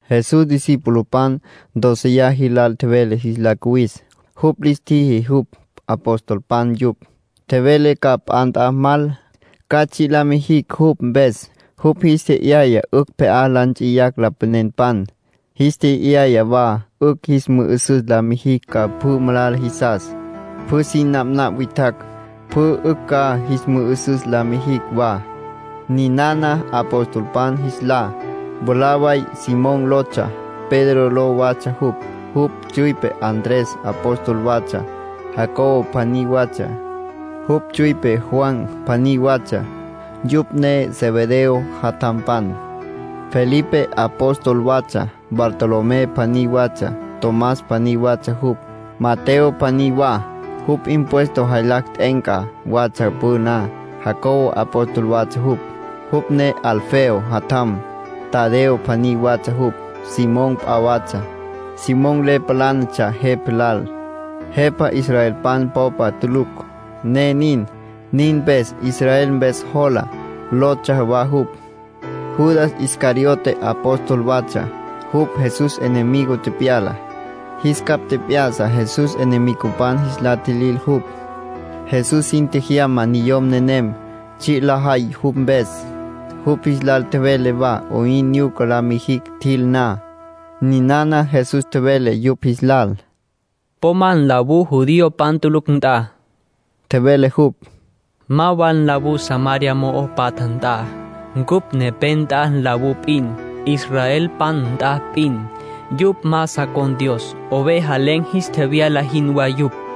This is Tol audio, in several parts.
Jesús discipulopan dóceya jilal tjevele jis la cuwis. Jupj lis tjiji jupj apostolpan yupj. Tjevele ca p'a nt'a mal, ca tsji' la mijicj jupj mpes. Jupj jis tje'yaya 'ücj pje'á la nts'iyacj lapanenpan. Jis tje'yaya wa 'ücj jis mü'ü'süs la mijicj ca pjü malala jisas. Pjü sin napnapj witjacj, pjü 'ücj ca jis mü'ü'süs la mijicj wa. Ninana apostolpan jis lá: mwalá way Simón lotsja. Pedro ló watsja jupj. Jupj tsüipe Andrés apóstol watsja. Jacobo pjaní watsja. Jupj tsüipe Juan pjaní watsja. Yupj ne Zebedeo jatjampan. Felipe apóstol watsja, Bartolomé pjaní watsja; Tomás pjaní watsja jupj. Mateo pjaní wa. Jupj impuesto jaylacj t'e'enca watsja püna. Jacobo apóstol watsja jupj, jupj ne Alfeo jatjam. Tadeo pjaní watsja jupj. Simón p'a watsja. Simón le palánatsja jepa lal, jepa israelpan popa tulucj, ne nin. Nin mpes “Israel Mpes Jola” lotsja wa jupj. Judas Iscariote apóstol watsja. Jupj Jesús enemigo tepyala. Jis capj tjep'ya'sa Jesús enemigopan jis la tjilil jupj. Jesús sin tjejyama niyom nenem, tsji' lajay jupj mpes. Jupj jis lal tjevele wa 'oyn nyuca la mijicj tjil na. Ninana Jesús tjevele yupj jis lal: “Po ma nlawú judiopan tulucj nt'a —tjevele jupj—. Ma wa nlawú Samaria mo'o patja nt'a. Cupj nepé nt'a nlawú p'in, israelpan nt'a p'in. Yupj ma sa con̈ Dios. Oveja len̈ jis tjevyala jinwá yupj.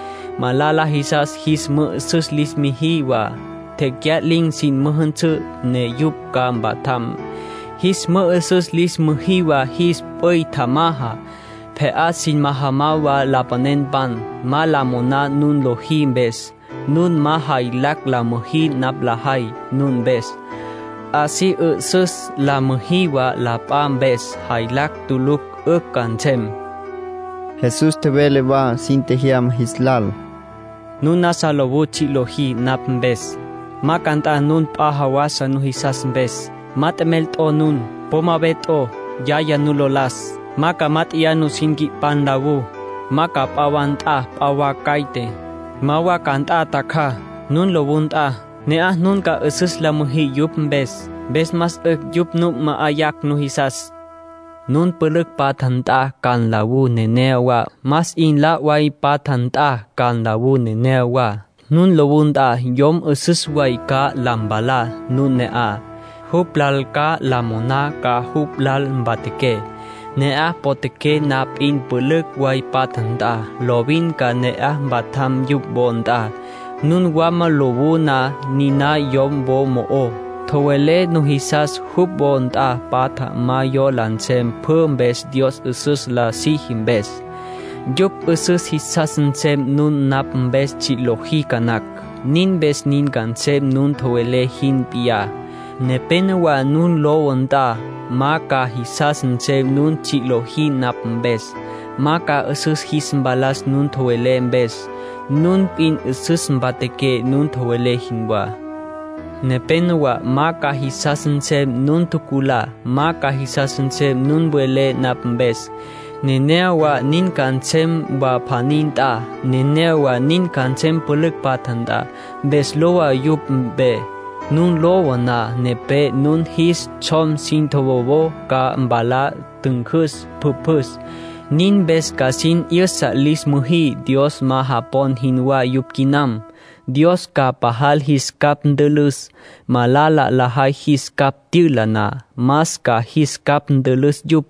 Malala jisas jis mü'ü'süs lis müjí wa. Tecya'lin̈ sin müjünsǘ, ne yupj ca mpatjam. Jis mü'ü'süs lis müjí wa jis p'üy tjamaja. Pje'á sin majamá wa lapanenpan. Ma la moná nun lojí mpes. Nun ma jaylacj la tjüjí napj la tjejay nun mpes. Así 'üsüs la müjí wa la p'a mpes. Jaylacj tulucj 'ücj ca nsem.” Jesús tjevele wa sin tjejyama jis lal: “Nun nasa lowú tsji' lojí napj mpes, ma ca nt'a nun p'a jawasa nujisas mpes. Ma t'emel t'o nun. Po ma ve t'o, yacjaya nu lo las. Ma ca mát'eya nusin nqui'pá nlawú. Ma ca p'a wa nt'a p'a wa caite. Ma wa ca nt'a tjacjaj. Nun lowú nt'a, ne'aj nun ca 'üsüs la müjí yupj mpes. Mpes más 'ücj yupj nu ma'ayacj nujisas. ”Nun pülücj patja nt'a ca nlawú neneyawá. Más 'in la' way patja nt'a ca nlawú neneyawá. Nun lowú nt'a, yom 'üsüs way ca la mpalá nun ne'aj. Jupj lal ca la moná ca jupj lal mpatjaqué. Ne'aj potjaqué na p'in pülücj way patja nt'a, lovin ca ne'aj mpatjaqué jupj wo nt'a. Nun wama lowú na, niná yom wo mo'ó, tjowelé nujisas jupj wo nt'a patja ma yola nsem pjü mpes Dios 'üsüs la siji mpes. Yupj 'üsüs jisas nsem nun napj mpes tsji' lojí ca nacj. Nin mpes nin ca nsem nun tjowelé jin p'iyá. Nepénowa nun lowú nt'a ma ca jisas nsem nun tsji' lojí napj mpes. Ma ca 'üsüs jis mpalas nun tjowelé mpes. Nun p'in 'üsüs mpatjaqué nun tjowelé jinwá. Nepénowa ma ca jisas nsem nun tjuculá. Ma ca jisas nsem nun welé napj mpes. Nenéyawa nin ca nsem wa pjaní nt'a. Nenéyawa nin ca nsem pülücj patja nt'a. Mpes lowa yupj mpe. Nun lowú na nepé, nun jis tsjom sin tjowowojó, ca palá ntüncüs pjüpjüs. Nin mpes ca sin 'yüsa lis müjí Dios ma japon jinwá yupj quinam. Dios ca pajal jis capj ntülüs, malala lajay jis capj tyüla na. Más ca jis capj ntülüs yupj,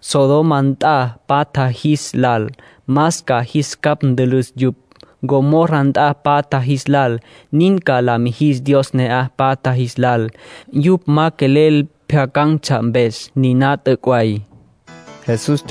Sodoma nt'a tapatja jis lal. Más ca jis capj ntülüs yupj, Gomorra nt'a tapatja jis lal. Nin ca la mijis Dios ne'aj patja jis lal, yupj ma quelel pjyacan̈tsja mpes. Niná t'üc' way”, tjevele Jesús.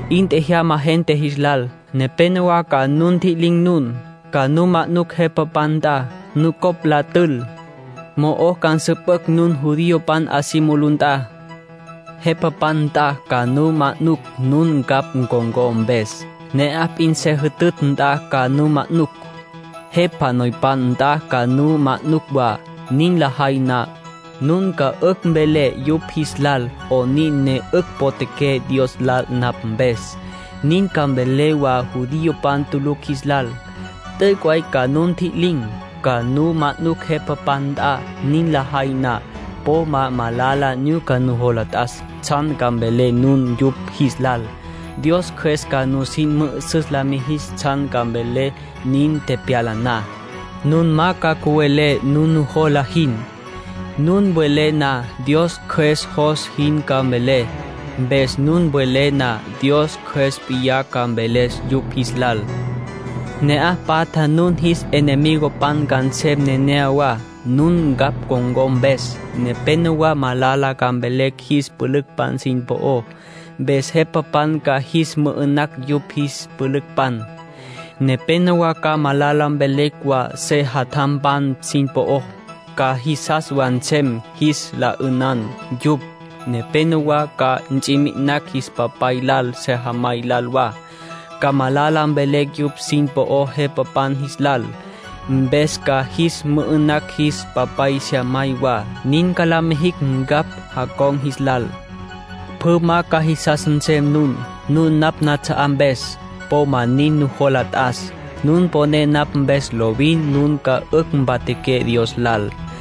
'In tjajama gente jis lal. Nepénowa ca nu ntji'lin̈ nun. Ca nu manucj jepapan nt'a, nucopj la tül. Mo'o ca nsüpücj nun judiopan 'a si mulú nt'a. Jepapan nt'a ca nu manucj nun ncapj con̈có mpes. Ne'aj p'in se jütütj nt'a ca nu manucj. Jepa noypan nt'a ca nu manucj wa. Nin lajay na, nun ca 'ücj mvelé yupj jis lal 'onin ne 'ücj potjaqué Dios lal napj mpes. Nin ca mvelé wa judiopan tulucj jis lal. T'üc' way ca nu ntji'lin̈, ca nu manucj jepapan nt'a. Nin lajay na, po ma malala nyuca nujola t'as tsjan ca mvelé nun yupj jis lal. Dios Cjües ca nusin mü'üsüs la mijis tsjan ca mvelé nin tepyala na. Nun ma ca cüwelé nun nujola jin. Nun welé na, Dios Cjües jos jin ca mvelé. Mpes nun welé na, Dios Cjües p'iyá ca mveles yupj jis lal. ”Ne'aj patja nun jis enemigopan ca nsem neneyawá, nun ncapj con̈có mpes. Nepénowa malala ca mvelecj jis pülücpan sin po'ó, mpes jepapan ca jis mü'ü'nacj yupj jis pülücpan. Nepénowa ca malala mvelecj wa sejatjampan sin po'ó. Ca jisas wa nsem jis la 'ünan yupj. Nepénowa ca ts'i mi'inacj jis papay lal, sejamay lal wa. Ca malala mvelecj yupj sin po'ó jepapan jis lal. Mpes ca jis mü'ü'nacj jis papay, sejamay wa. Nin ca la mijicj ncapj jacon̈ jis lal. Pjü ma ca jisas nsem nun, nun napj nats'a'á mpes. Po ma nin nujola t'as. Nun poné napj mpes lovin, nun ca 'ücj mpatjaqué Dios lal.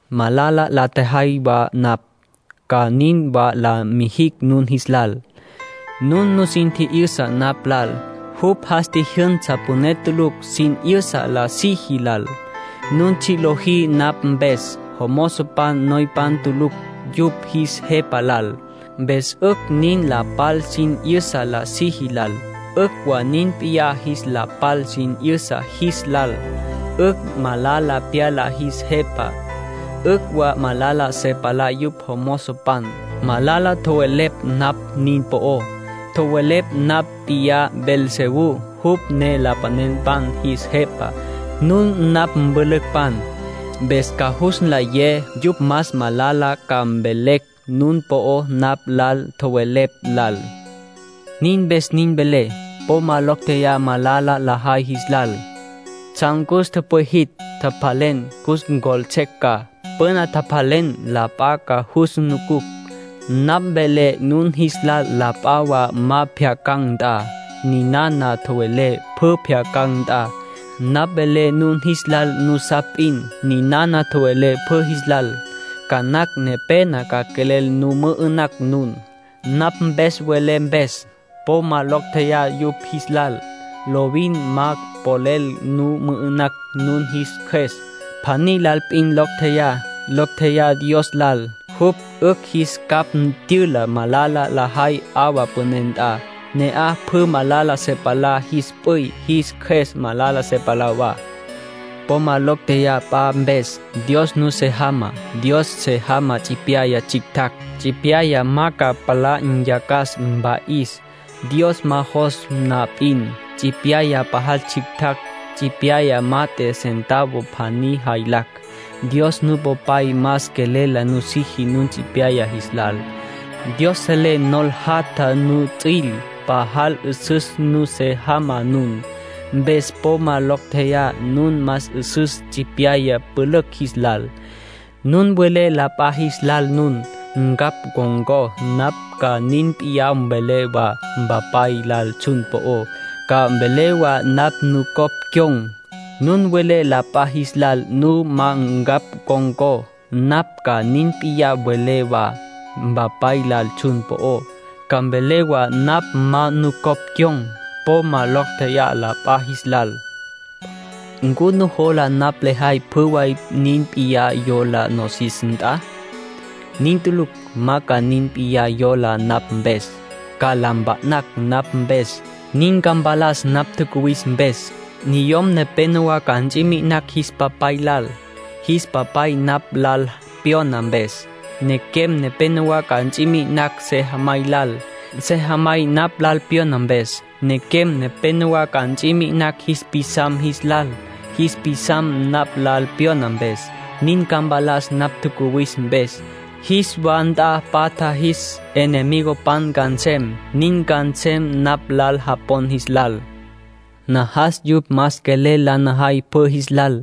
”Malala la ntjajay wa napj, ca nin wa la mijicj nun jis lal. Nun nusin tji'yüsa napj lal. Jupj jas tji'yüsa püné tulucj sin 'yüsa la siji lal. Nun tsji' lojí napj mpes. Mozopan noypan tulucj yupj jis jepa lal. Mpes 'ücj nin la pal sin 'yüsa la siji lal, 'ücj wa nin p'iyá jis la pal sin 'yüsa jis lal. 'Ücj malala pyala jis jepa, 'ücj wa malala se palá jupj jomozopan. Malala tjowelepj napj nin po'ó. Tjowelepj napj p'iyá Beelzebú, jupj ne lapanenpan jis jepa. Nun napj mpülücpan. Mpes ca jus nlayé yupj más malala ca mvelecj nun po'ó napj lal tjowelepj lal. ”Nin mpes nin velé: po ma locj tjeyá malala lajay jis lal. Tsjan cus tüpwijitj, tjapjalen, cus ncjoltses ca. Püna tjapjalen la p'a ca jus nucucj. Napj velé nun jis lal la p'a wa ma pjyacan̈ nt'a. Ninana tjowelé pjü pjyacan̈ nt'a. Napj velé nun jis lal nusapj p'in. Ninana tjowelé pjü jis lal. Ca nacj nepena ca quelel nu mü'ü'nacj nun, napj mpes welé mpes. Po ma locj tjeyá yupj jis lal. Lovin ma polel nu mü'ü'nacj nun jis qjues. Pjaní lal p'in locj tjeyá. Locj tjeyá Dios lal. Jupj 'ücj jis capj tyüla malala lajay 'awa püné nt'a. Ne'aj pjü malala se palá jis p'üy, jis qjues malala se palá wa. ”Po ma locj tjeyá p'a mpes. Dios nusé jamá. Dios se jamá tsipyaya tsjictjacj. Tsipyaya ma ca palá nyacas, mpa'is, Dios ma jos na p'in. Tsipyaya pajal tsjictjacj. Tsipyaya mat'e, centavo pjaní jaylacj. Dios Nupopay. Más quelel la nusiji nun tsipyaya jis lal. Dios selé nol jatja nuts'üil. Pajal 'üsüs nusé jamá nun. Mpes po ma locj tjeyá. Nun más 'üsüs tsipyaya pülücj jis lal. ”Nun welé la p'a jis lal nun ncapj con̈có, napj ca nin p'iyá mvelé wa Mpapay lal tsjun po'ó. Ca mvelé wa napj nucopj cyon̈. Nun welé la p'a jis lal nun ma ncapj con̈có, napj ca nin p'iyá mvelé wa Mpapay lal tsjun po'ó. Ca mvelé wa napj ma nucopj cyon̈. Po ma locj tjeyá la p'a jis lal. ”¿Ncu nujola napj lejay pjü way nin p'iyá yola nosis nt'a? Nin tulucj. Ma ca nin p'iyá yola napj mpes. Ca la mpa'nacj napj mpes. Nin ca mpalas napj tjacuwis mpes. ‘Niyom nepenowá ca ts'i mi'inacj jis papay lal, jis papay napj lal pyona mpes. Nequem nepenowá ca ts'i mi'inacj sejamay lal, sejamay napj lal pyona mpes. Nequem nepenowá ca ts'i mi'inacj jis pisam jis lal, jis pisam napj lal pyona mpes.’ Nin ca mpalas napj tjacuwis mpes. ‘Jis wa nt'a patja jis enemigopan ca nsem.’ Nin ca nsem napj lal japon jis lal. ”Najas yupj más quelel la najay pjü jis lal.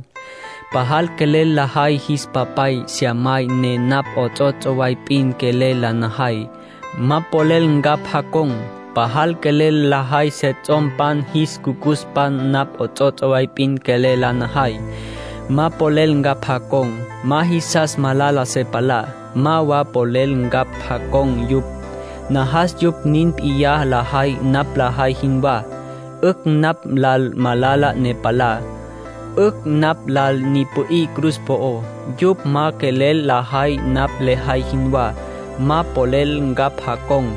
Pajal quelel lajay jis papay, sejamay, ne napj 'ots'ots' way p'in quelel la najay, ma polel ncapj jacon̈. Pajal quelel lajay sejatjampan, jis jucucuspan, napj 'ots'ots' way p'in quelel la najay, ma polel ncapj jacon̈. Ma jisas malala se palá, ma wa polel ncapj jacon̈ yupj. Najas yupj nin p'iyá lajay napj lejay jinwá. 'Ücj napj lal malala ne palá. 'Ücj napj lal ni pü'í cruz po'ó. Yupj ma quelel lajay napj lejay jinwá, ma polel ncapj jacon̈.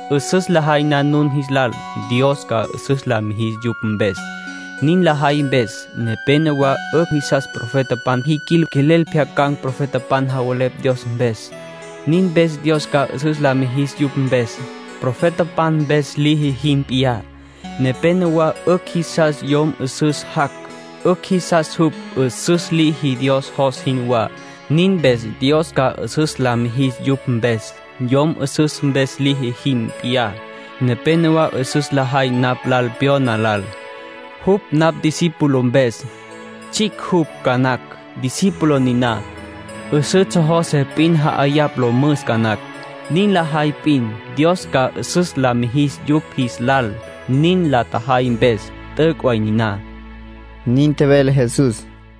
'Üsüs lajay na nun jis lal, Dios ca 'üsüs la mijis yupj mpes, nin lajay mpes. Nepénowa 'ücj jisas profetapan jiquil. Quelel pjyacan̈ profetapan javelepj Dios mpes. Nin mpes Dios ca 'üsüs la mijis yupj mpes, profetapan mpes liji jin p'iyá. Nepénowa 'ücj jisas yom 'üsüs jac'. 'Ücj jisas jupj 'üsüs liji Dios jos jinwá. Nin mpes Dios ca 'üsüs la mijis yupj mpes, yom 'üsüs mpes liji jin p'iyá. Nepénowa 'üsüs lajay napj lal pyona lal, jupj napj discípulo mpes. Tsjicj jupj ca nacj, discípulo niná. 'Üsǘ tsjojose p'in ja'ayapj lo müs ca nacj. Nin lajay p'in, Dios ca 'üsüs la mijis yupj jis lal nin la tjajay mpes. T'üc' way niná”, nin tjevele Jesús.